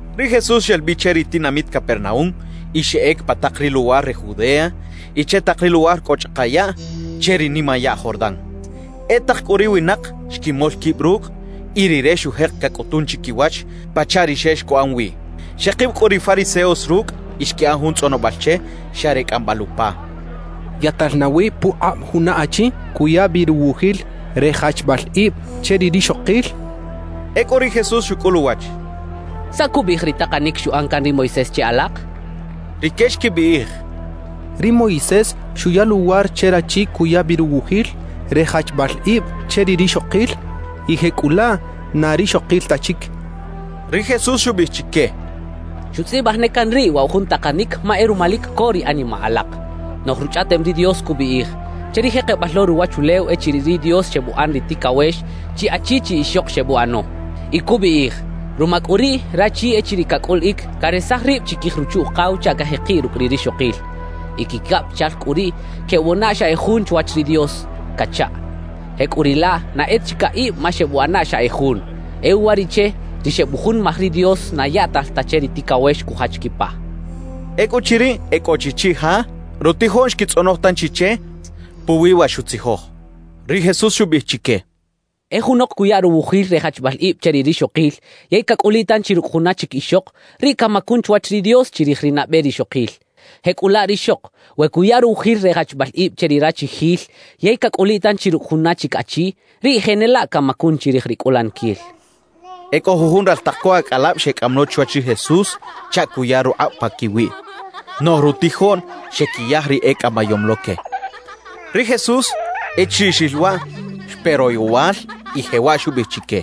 Ri Jesús xel bi che ri tinamit Capernaúm y xeꞌec pa tak ri luwar re Judea y che tak ri luwar cꞌo chꞌaka yaꞌ che ri nimayaꞌ Jordán. E tak cꞌu ri winak xquimol quib rucꞌ, y Rire xujek cacꞌutun chiquiwach pachaꞌ ri xex cuꞌan wi. Xekib cꞌu ri fariseos rucꞌ y xquiꞌan jun tzꞌonobal che xa re cꞌambal upa: —¿Yaꞌtal nawi pukꞌab juna achi cuya bi ruwujil re jachbal ib che ri rixokil? —xechaꞌ. Ecꞌu ri Jesús xucꞌul uwach: —¿Saꞌ cubiꞌij ri takanic xuꞌan can ri Moisés che alak? —xchaꞌ. Rique xquibiꞌij: —Ri Moisés xuya luwar che rachi cuya bi ruwujil re jachbal ib che ri rixokil y jecꞌulaꞌ na rixokil ta chic —xechaꞌ. Ri Jesús xubiꞌij chique: —Xutzꞌibaj ne can riꞌ waꞌ wa jun takanic ma e ruma lic co ri animaꞌ alak. Noꞌj Ruchꞌaꞌtem ri Dios cubiꞌij: Che ri jekebal lo ruwachulew echiriꞌ ri Dios xebuꞌan ri ticawex, chi achi chi ixok xebuꞌano. Y cubiꞌij: Ruma cꞌu riꞌ, rachi echiriꞌ cacꞌuliꞌic, caresaj rib chiquij ruchu-ukaw chaꞌ cajekiꞌ rucꞌ ri rixokil; y quicabichal cꞌu riꞌ quebuꞌana xa e jun chwach ri Dios cachaꞌ. Jecꞌuriꞌlaꞌ, na e ta chi caꞌib ma xebuꞌana xa e jun. E uwariꞌche, ri xebujunimaj ri Dios, na yaꞌtal ta che ri ticawex cujach quipa —xchaꞌ. Ecꞌuchiriꞌ e cꞌo chi chiꞌja, rutijoꞌn xquitzꞌonoj tanchi che puwi wa xutzijoj. Ri Jesús xubiꞌij chique: —E junok cuya ruwujil re jachbal ib che ri rixokil yey cacꞌuliꞌ tanchi rucꞌ juna chic ixok, riꞌ camacun chwach ri Dios chirij ri nabe rixokil. Jecꞌulaꞌ rixok, we cuya ruwujil re jachbal ib che ri rachijil yey cacꞌuliꞌ tanchi rucꞌ juna chic achi, riꞌ jenelaꞌ camacun chirij ri cꞌulaniquil —xchaꞌ. E cꞌo jujun raltak co acꞌalab xecꞌam lo chwach ri Jesús chaꞌ cuya rukꞌab paquiwiꞌ. Noꞌj rutijoꞌn xequiyaj ri ecꞌamayom lo que. Ri Jesús, echiriꞌ xril waꞌ, xpe royowal y jewaꞌ xubiꞌij chique: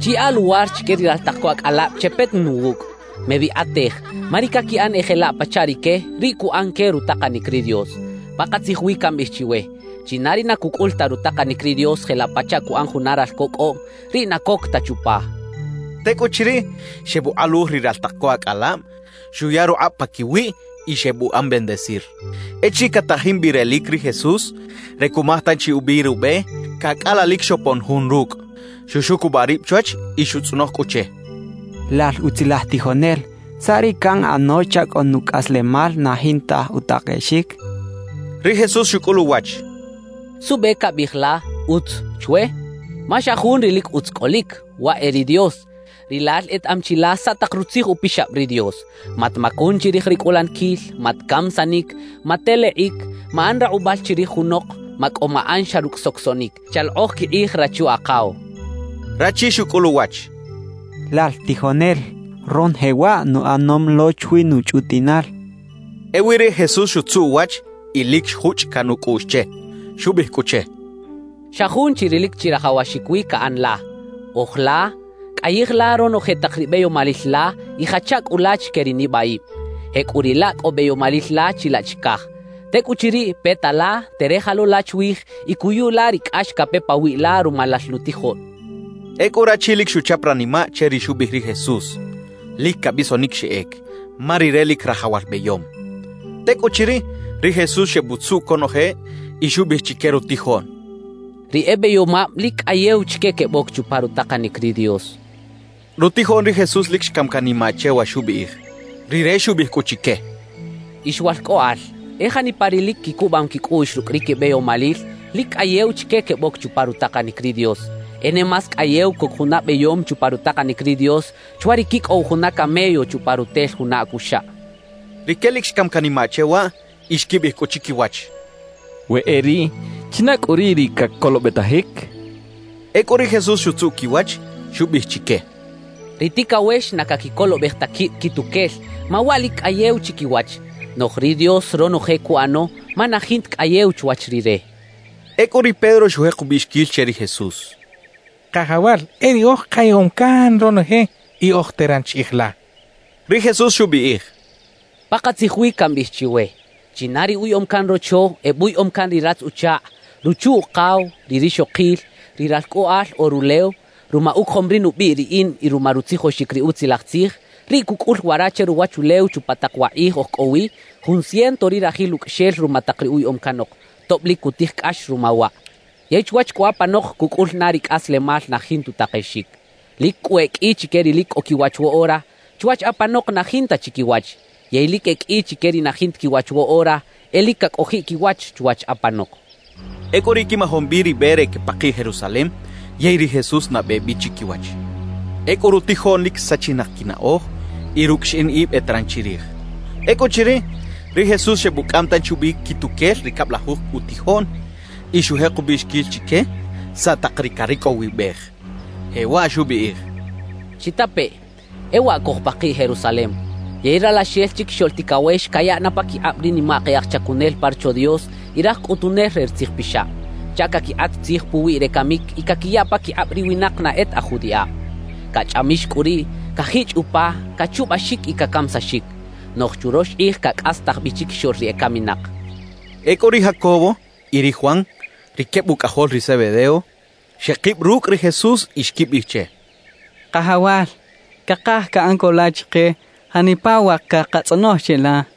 «Chiyaꞌa luwar chique ri raltak co acꞌalab chepeta na wucꞌ. Mebikꞌatej; ma ri caquiꞌan e jelaꞌ pachaꞌ rique, riꞌ cuꞌan que rutakanic ri Dios. Pakatzij wi cambiꞌij chiwe: China ri na cucꞌul ta rutakanic ri Dios jelaꞌ pachaꞌ cuꞌan juna ralco cꞌoꞌm, riꞌ na coc ta chupa» xchaꞌ. Tecꞌuchiriꞌ, xebukꞌaluj ri raltak co acꞌalab, xuya rukꞌab paquiwiꞌ y xebuꞌan bendecir. Echiriꞌ catajin bi relic ri Jesús re cumaj tanchi ubi rube, cacꞌalalic xopon jun rucꞌ, xuxucubaꞌ rib chwach y xutzꞌonoj cꞌu che: —Lal utzilaj tijonel, ¿saꞌ ri canꞌano chaꞌ cꞌo nucꞌaslemal na jinta utakexic? —xchaꞌ. Ri Jesús xucꞌul uwach: —¿Suꞌbe cabiꞌij la “utz” chwe? Ma xa jun ri lic utz cꞌolic, waꞌ e ri Dios. Rilal etaꞌam chi la saꞌ tak Rutzij Upixab ri Dios: “Matmacun chirij ri cꞌulaniquil. Matcamisanic. Matelekꞌic. Maꞌan rakꞌubal chirij junok. Macꞌo maꞌan xa rucꞌ socosoꞌnic. Chalokꞌoj quikꞌij rachu-akaw” —xcha che. Rachi xucꞌul uwach: —Lal tijonel, ronoje waꞌ nuꞌanom lo chwi nuchꞌutiꞌnal —xchaꞌ. Ewi ri Jesús xutzuꞌ uwach y lic xjuchꞌ can ucꞌuꞌx che. Xubiꞌij cꞌu che: —Xa jun chi ri lic chirajawaxic wi caꞌan la: Oj la, cꞌayij la ronoje tak ri beyomalil la y jacha cꞌu la chique ri nibaꞌib; jecꞌuriꞌlaꞌ cꞌo beyomalil la chilaꞌ chicaj. Tecꞌuchiriꞌ, peta la, terej lo la chwij y cuyu la ri cꞌax cape pawiꞌ la ruma lal nutijoꞌn —xcha che. Ecꞌu rachi lic xuchap ranimaꞌ che ri xubiꞌij ri Jesús; lic cabisonic xeꞌec, ma rire lic rajawal beyom. Tecꞌuchiriꞌ, ri Jesús xebutzuꞌ conoje y xubiꞌij chique rutijoꞌn: —Ri e beyomab lic cꞌayew chique queboc chupa rutakanic ri Dios —xchaꞌ. Rutijoꞌn ri Jesús lic xcam canimaꞌ che wa xubiꞌij. Rire xubiꞌij cꞌu chique: —Ix walcꞌoꞌal, e janipa ri lic quicubam quicꞌuꞌx rucꞌ ri quibeyomalil, lic cꞌayew chique queboc chupa rutakanic ri Dios. E ne más cꞌayew coc juna beyom chupa rutakanic ri Dios chwa ri quicꞌow juna camello chupa rutel juna acuxaꞌ —xchaꞌ. Rique lic xcam canimaꞌ che waꞌ y xquibiꞌij cꞌu chiquiwach: «We e riꞌ, ¿china cꞌu riꞌ ri cacolobetajic?» xechaꞌ. Ecꞌu ri Jesús xutzuꞌ quiwach, xubiꞌij chique: —Ri ticawex na caquicolobej ta quib quituquel ma waꞌ lic cꞌayew chiquiwach, noꞌj ri Dios ronoje cuꞌano ma na jinta cꞌayew chwach Rire —xchaꞌ. Ecꞌu ri Pedro xujek ubiꞌxiquil che ri Jesús: —Kajawal, e riꞌoj kayaꞌom can ronoje y oj teran chiꞌij la —xchaꞌ. Ri Jesús xubiꞌij: —Pakatzij wi cambiꞌij chiwe: China ri uyaꞌom can rocho, ebuyaꞌom can ri ratz-uchakꞌ, ruchu-ukaw, ri rixokil, ri ralcꞌoꞌal o rulew, ruma ucojom ri nubiꞌ riꞌin y ruma rutzijoxic ri Utzilaj Tzij, riꞌ cucꞌul wara che ruwachulew chupa tak wa kꞌij oj cꞌo wi, jun ciento ri rajil ucꞌaxel ruma tak ri uyaꞌom canok, tob lic cutij cꞌax ruma waꞌ. Yey chwach cꞌu apanok cucꞌul na ri cꞌaslemal na jinta utakexic. Lic cꞌu e qꞌui chique ri lic cꞌo quiwach woꞌora, chwach apanok na jinta chi quiwach; yey lic e qꞌui chique ri na jinta quiwach woꞌora, e lic cacꞌojiꞌ quiwach chwach apanok —xchaꞌ. Ecꞌu riꞌ quimajom bi ri be re quepakiꞌ Jerusalem, yey ri Jesús nabe bi chiquiwach. Ecꞌu rutijoꞌn lic sachinak quinaꞌoj y rucꞌ xiꞌin ib eteran chirij. Ecꞌuchiriꞌ, ri Jesús xebucꞌam tanchi ubi quituquel ri cablajuj utijoꞌn y xujek ubiꞌxiquil chique saꞌ tak ri caricꞌowibej. Jewaꞌ xubiꞌij: —Chitapeꞌ: E waꞌ cojpakiꞌ Jerusalem, yey Ralaxel Chiquixoꞌl Ticawex cayaꞌ na paquikꞌab ri nimak e aj chacunel pa Rocho Dios y raj cꞌutunel re ri tzijpixab, chaꞌ caquikꞌat tzij puwiꞌ re camic y caquiya paquikꞌab ri winak na e ta aj judiꞌab. Cachꞌamix cꞌu riꞌ, cajichꞌ upa, cachubaxic y cacamisaxic. Noꞌj churox kꞌij cacꞌastaj bi chiquixoꞌl ri ecaminak —xchaꞌ. Ecꞌu ri Jacobo y ri Juan, ri queb ucꞌajol ri Zebedeo, xekib rucꞌ ri Jesús y xquibiꞌij che: —Kajawal, cakaj caꞌan co la chike janipa wa cakatzꞌonoj cheꞌla —xechaꞌ.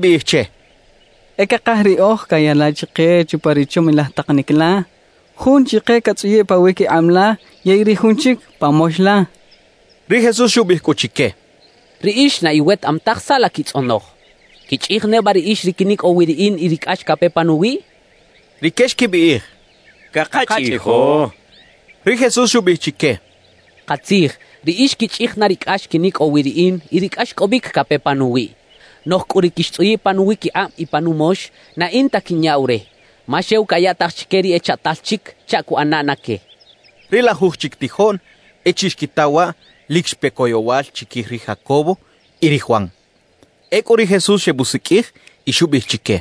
Rique xquibiꞌij che: —E cakaj riꞌoj caya la chike chupa ri chomilaj takanic la, jun chike catzꞌuyiꞌ pawiquikꞌab la yey ri jun chic pa mox la —xechaꞌ. Ri Jesús xubiꞌij cꞌu chique: —Riꞌix na iwetaꞌam taj saꞌ la quitzꞌonoj. ¿Quichꞌij neba riꞌix ri quinicꞌow wi riꞌin y ri cꞌax cape panuwiꞌ? —xchaꞌ. Rique xquibiꞌij: —Cakachꞌijo —xechaꞌ. Ri Jesús xubiꞌij chique: —Katzij, riꞌix quichꞌij na ri cꞌax quinicꞌow wi riꞌin y ri cꞌaxcꞌobic cape panuwiꞌ. Noꞌj cꞌu ri quixtzꞌuyiꞌ pa nuwiquikꞌab y pa numox, na in ta quinyaꞌw re, ma xew cayaꞌtaj chique ri echaꞌtal chic chaꞌ cuꞌana na que —xchaꞌ. Ri lajuj chic tijoꞌn, echiriꞌ xquita waꞌ, lic xpe coyowal chiquij ri Jacobo y ri Juan. Ecꞌu ri Jesús xebusiqꞌuij y xubiꞌij chique: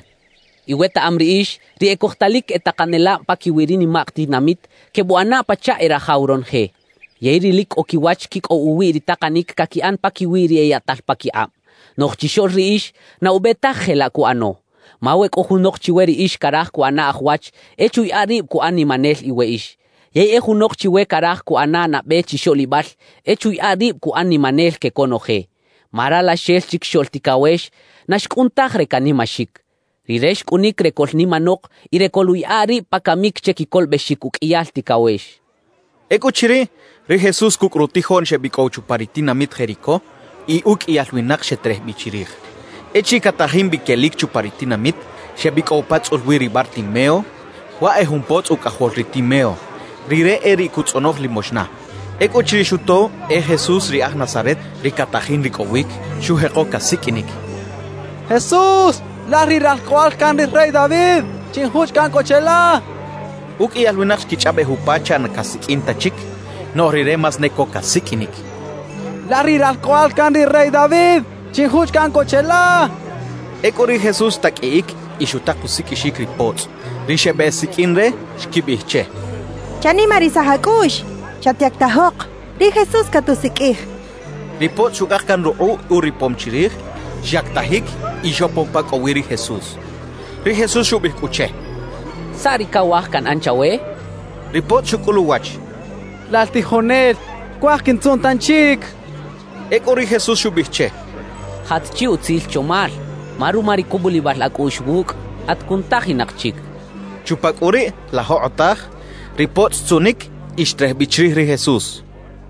—Iwetaꞌam riꞌix, ri ecojtalic e takanelab paquiwi ri nimak tinamit quebuꞌana pachaꞌ e rajaw ronoje, yey ri lic cꞌo quiwach quicꞌow uwiꞌ ri takanic caquiꞌan paquiwi ri eyaꞌtal paquikꞌab. Noꞌj chixoꞌl riꞌix na ube taj jelaꞌ cuꞌano. Ma we cꞌo junok chiwe riꞌix caraj cuꞌana aj wach, e chuyaꞌa rib cuꞌan nimanel iweꞌix. Yey e junok chiwe caraj cuꞌana nabe chixoꞌlibal, e chuyaꞌa rib cuꞌan nimanel que conoje. Ma Ralaxel Chiquixoꞌl Ticawex na xcꞌun taj re canimaxic. Rire xcꞌunic re coꞌlnimanok y re coluꞌyaꞌa rib pa camic che quicolobexic uqꞌuiyal ticawex —xchaꞌ. Ecꞌuchiriꞌ, ri Jesús cucꞌ rutijoꞌn xebicꞌow chupa ri tinamit Jericó, y uqꞌuiyal winak xeterej bi chirij. Echiriꞌ catajin bi quelic chupa ri tinamit, xebicꞌow pa tzꞌul wi ri Bartimeo, waꞌ e jun potzꞌ ucꞌajol ri Timeo. Rire e riꞌ cutzꞌonoj limoxna. Ecꞌuchiriꞌ xuto e Jesús ri aj Nazaret ri catajin ricꞌowic, xujeko casiqꞌuinic: —¡Jesús, lal ri Ralcꞌoꞌal can ri rey David, chinjuchꞌ caꞌn co cheꞌla! —xchaꞌ. Uqꞌuiyal winak xquichꞌaꞌbej upa chaꞌ na casiqꞌuin ta chic, noꞌj rire más ne co casiqꞌuinic: —¡Lal ri Ralcꞌoꞌal can ri rey David, chinjuchꞌ caꞌn co cheꞌla! —cachaꞌ. Ecꞌu ri Jesús xtaqꞌuiꞌic y xutak usiqꞌuixic ri potzꞌ. Ri xebeꞌsiqꞌuin re xquibiꞌij che: —¡Chanimarisaj acꞌuꞌx! ¡Chatyactajok! Ri Jesús catusiqꞌuij —xechaꞌ. Ri potzꞌ xucꞌak can rukꞌuꞌ uripom chirij, xyactajic y xopon pa cꞌo wi ri Jesús. Ri Jesús xubiꞌij cꞌu che: —¿Saꞌ ri cawaj canꞌan chawe? —xchaꞌ. Ri potzꞌ xucꞌul uwach: —Lal tijonel, cuaj quintzuꞌn tanchic —xchaꞌ. Ecꞌu ri Jesús xubiꞌij che: —Jat chi utzil chomal, ma ruma ri cubulibal acꞌuꞌx wucꞌ, at cunutajinak chic —xchaꞌ. Chupa cꞌu riꞌ la jokꞌotaj, ri potzꞌ xtzuꞌnic y xterej bi chirij ri Jesús.